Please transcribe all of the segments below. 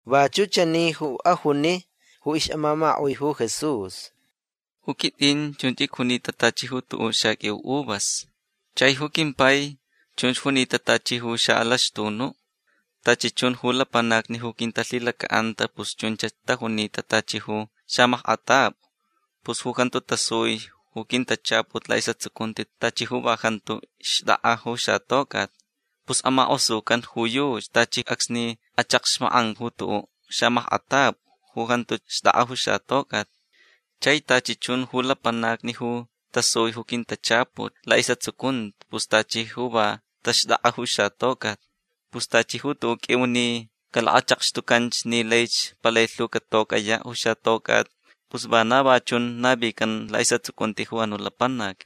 Vachuʼ chani ju ajuni ju ixʼamamakaʼui ju Jesús: ―Ju quitʼin chunch icjunita tachi ju tuʼuʼ xaqʼuiu uvas. Chai ju quimpai chunch junita tachi ju xaʼalaxtunuʼ. Tachi chun ju lapanacni ju quintalhilacaʼanta pus chunch tajunita tachi ju xamackʼatapʼu. Pus ju jantu tasui ju quintachaput laʼisʼatsucunti tachi ju va jantu xtʼakʼa ju xatocʼat. Pus amakʼosucan ju yuchi tachi acsni achakxmakʼan ju tuʼuʼ xamackʼatapʼu ju jantuch xtʼakʼa ju xatocʼat. Chai tachi chun ju lapanacni ju tasui ju quintachaput laʼisʼatsucunti pus tachi ju va taxtʼakʼa ju xatocʼat. Pus tachi ju tuʼuʼ qʼuiu ni calakachakxtucanch ni laich palai lhu catocʼayaʼ ju xatocʼat pus vana va chun navican laʼisʼatsucunti ju anuʼ lapanac.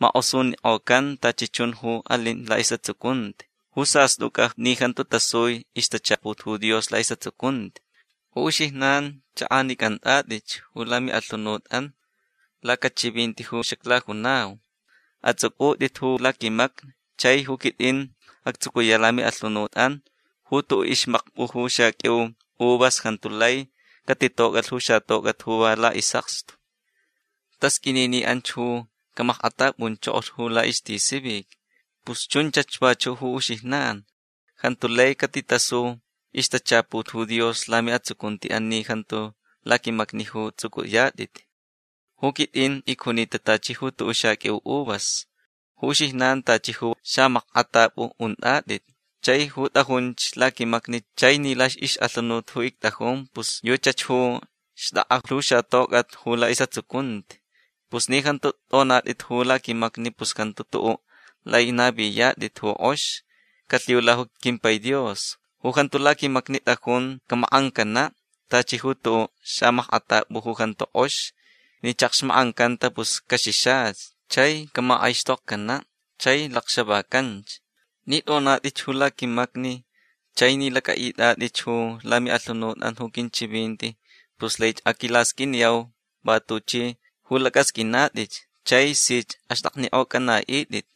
Makʼosunikʼocan tachi chun ju alin laʼisʼatsucunti ju sastʼucʼa ni jantu tasui ixtachaput ju Dios laʼisʼatsucunti. Ju uxijnan chʼakʼanicʼantʼatʼitch ju lamiʼalhunutʼan lacachivinti ju xaclajunau. Atsʼucʼutʼit ju laquimacni. Chai ju quitʼin actsucuyaʼ ju lamiʼalhunutʼan. Ju tuʼuʼ ixmakpʼu ju xaqʼuiu uvas jantu lai catitocʼalh ju xatocʼat ju va laʼisʼakstu. Tasqʼuini ni anch ju camackʼatʼapʼunchokolh ju laʼistisivic. Pus chunchach vachuʼ ju uxijnan. Jantu lai catitasu ixtachaput ju Dios ju lamiʼatsucuntiʼan ni jantu laquimacni ju tsʼucʼuyatʼit. Ju quitʼin icjunita tachi ju tuʼuʼ xaqʼuiu uvas. Ju uxijnan tachi ju xamackʼatapʼu untʼatʼit. Chai ju tʼajunch laquimacni chai ni laʼixʼalhunut ju ictʼajun pus yuchach ju xtʼakʼa lhu xatocʼat ju laʼisʼatsucunti. Pus ni jantu tʼonatʼit ju laquimacni pus jantu tuʼuʼ lai naviyatʼit ju kʼox calhiula ju quimpai Dios. Ju jantu laquimacni tʼajun camakʼancanaʼ tachi ju tuʼuʼ xamackʼatapʼu ju jantu kʼox. Ni chakxmakʼancanta pus caxixach. Chai camakʼaixtokcanaʼ. Chai lacxavacanch. Ni tʼonatʼitch ju laquimacni chai ni lacʼaʼitʼatʼitch ju lamiʼalhunutʼan ju quinchivinti pus laich aquilasqʼuiniyau va tuchʼi ju lacʼasqʼuinatʼitch chai sich axtʼaknikʼocʼanaʼitʼit.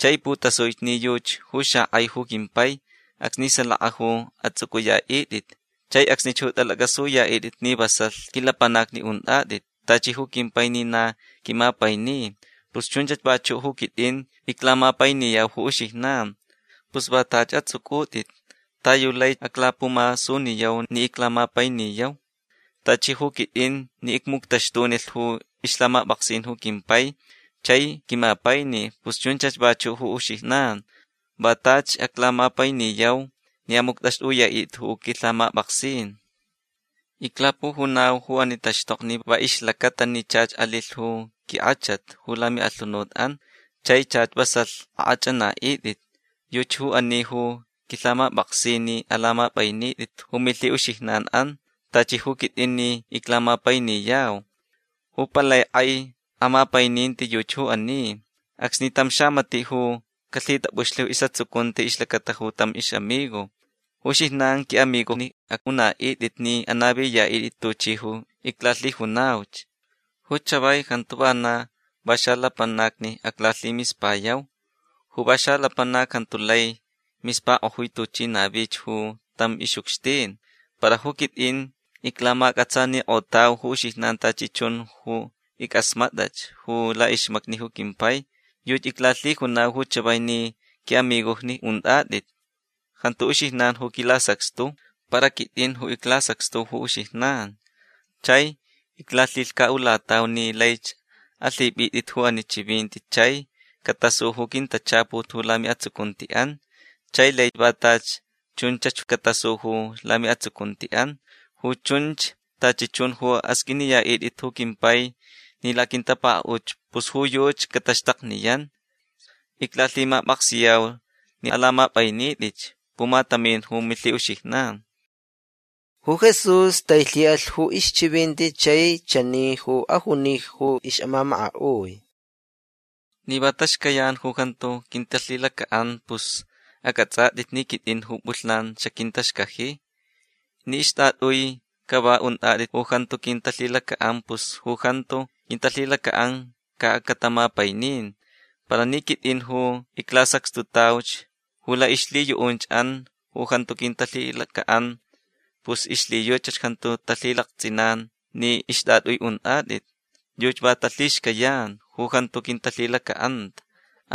Chai putasui ni yuchi ju xakʼai ju quimpai acsni salaka ju atsʼucʼuyaʼitʼit. Chai acsnich ju atʼalacʼasuyaʼitʼit ni vasalhch quilapanacni untʼatʼit. Tachi ju quimpai ni na quimapaini pus chunchach vachuʼ ju quitʼin iclamapainiyau ju uxijnan. Pus va tachi atsʼucʼutʼit ta yu laich aclapumasuniyau ni iclamapainiyau. Tachi ju quitʼin ni icmuctaxtunilh ju ixlhamapʼaksin ju quimpai chai quimapaini pus chunchach vachuʼ ju uxijnan. Va tachi aclamapainiyau ni amuctʼaxtʼuyaʼitʼit ju quilhamapʼaksin. Iclapujunau ju ani taxtokni va ixlacata ni chach alilh ju quinkʼachat ju lamiʼalhunutʼan. Chai chach vasalh akʼachʼanaʼitʼit. Yuchi ju ani ju quilhamapʼaksin ni alamapʼainitʼit ju milhiʼuxijnanʼan tachi ju quitʼin ni iclamapainiyau. Ju palai kʼai amapaininti yuchi ju ani. Acsni tam xamatiʼ ju calhitapʼuxlh ju isʼatsucunti ixlacata tam ixʼamigo. Ju uxijnan quiʼamigojni aʼunaʼitʼit ni anaviyaʼitʼit tuchi ju iclalhijunauch. Ju chavai jantu va na va xalapanacni aclalhimispayau. Ju va xalapanac jantu lai mispakʼojui tuchi navich ju tam ixʼucxtin. Para ju quitʼin iclamacʼatsanikʼotau ju uxijnan tachi chun ju ickʼasmatʼach ju laʼixmacni ju quimpai. Yuchi iclalhijunau ju chavai ni quiʼamigojni untʼatʼit. Jantu uxijnan ju quilasacxtu. Para quitʼin ju iclasacxtu ju uxijnan. Chai iclalhilhcaʼulatau ni laich alhipʼitʼit ju ani chivinti chai catasu ju quintachaput ju lamiʼatsucuntiʼan chai lai va tachi chunchach catasu ju lamiʼatsucuntiʼan. Ju chunch tachi chun ju asqʼuiniyaʼitʼit ju quimpai ni laquintapakaʼutch pus ju yuchi cataxtakniyan. Iclalhimapʼaksiyau ni alamapʼainitʼitch pumatamin ju milhiʼuxijnan. Ju Jesús tailhiʼalh ju ixchivinti chai chani ju ajuni ju ixʼamamakaʼui: ―Ni va taxcayan ju jantu quintalhilacaʼan pus acʼatsʼatʼit ni quitʼin ju pʼulhnan xaquintaxcaji. Ni ixtʼatʼui cava untʼatʼit ju jantu quintalhilacaʼan pus ju jantu quintalhilacaʼan ca catamapainin. Para ni quitʼin ju iclasacxtutauch ju laʼixlhiyuʼunchʼan ju jantu quintalhilacaʼan pus ixlhiyuchach jantu talhilaktsʼinan ni ixtʼatʼui untʼatʼit. Yuchi va talhixcayanch ju jantu quintalhilacaʼanta.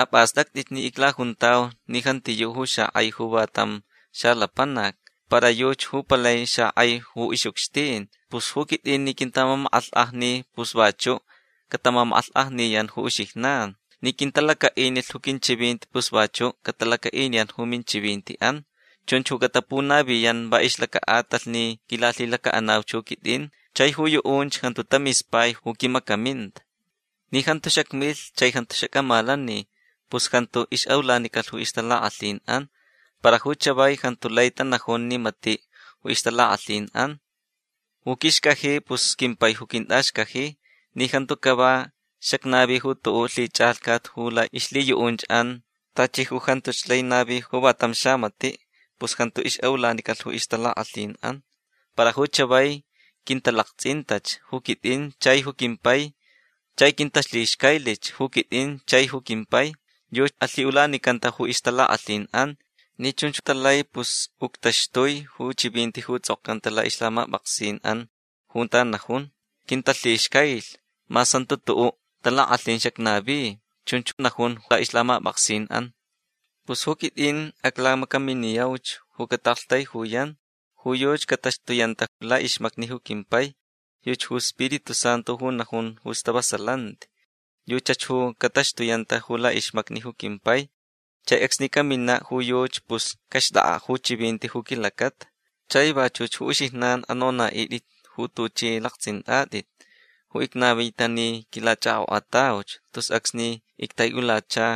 Apʼastʼactʼitch ni iclajuntau ni jantiyuʼ ju xakʼai ju va tam xalapanac. Para yuchi ju palai xakʼai ju ixʼucxtin. Pus ju quitʼin ni quintamamakʼalhkʼajni pus vachuʼ catamamakʼalhkʼajniyan ju uxijnan. Ni quintalacaʼinilhch ju quinchivinti pus vachuʼ catalacaʼiniyan ju minchivintiʼan. Chunch ju catapunaviyan va ixlacaʼatalh ni quilalhilacaʼanauch ju quitʼin chai ju yuʼunch jantu tamispai ju quimacaminta. Ni jantu xacmilh chai jantu xacʼamalani pus jantu ixʼaʼulanicalh ju ixtalakʼalhinʼan. Para ju chavai jantu lai tanajun ni matiʼ ju ixtalakʼalhinʼan. Ju quixcaji pus quimpai ju quintʼaxcaji. Ni jantu cava xacnavi tuʼuʼ lhichʼalhcat ju laʼixlhiyuʼunchʼan tachi ju jantuch lai navi ju va tam xamatiʼ pus jantu ixʼaʼulanicalh ju ixtalakʼalhinʼan. Para ju chavai quintalaktsʼintach ju quitʼin chai ju quimpai chai quintalhixcailich ju quitʼin chai ju quimpai. Yuchi alhiʼulanicanta ju ixtalakʼalhinʼan. Ni chunch talai pus uctaxtui ju chivinti ju tsʼokcanta laʼixlhamapʼaksinʼan junta najun: “Quintalhixcailh mas jantu tuʼuʼ talakʼalhin xacnavi”. Chunch najun laʼixlhamapʼaksinʼan. Pus ju quitʼin aclamacaminiyauch ju cataʼaktaijuyan. Ju yuchi cataxtuyanta laʼixmacni ju quimpai. Yuchi ju Spiritu Santu ju najun ju stavasalanti. Yuchach ju cataxtuyanta laʼixmacni ju quimpai. Chai acsni caminaʼ ju yuchi pus caxtʼakʼaʼ ju chivinti ju quilacata. Chai vachuch ju uxijnan anonaʼitʼit ju tuchʼi laktsʼintʼatʼit ju icnavita ni quilachʼakʼokʼatauch tus acsni ictaiʼulacha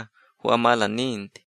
ju amalaninti.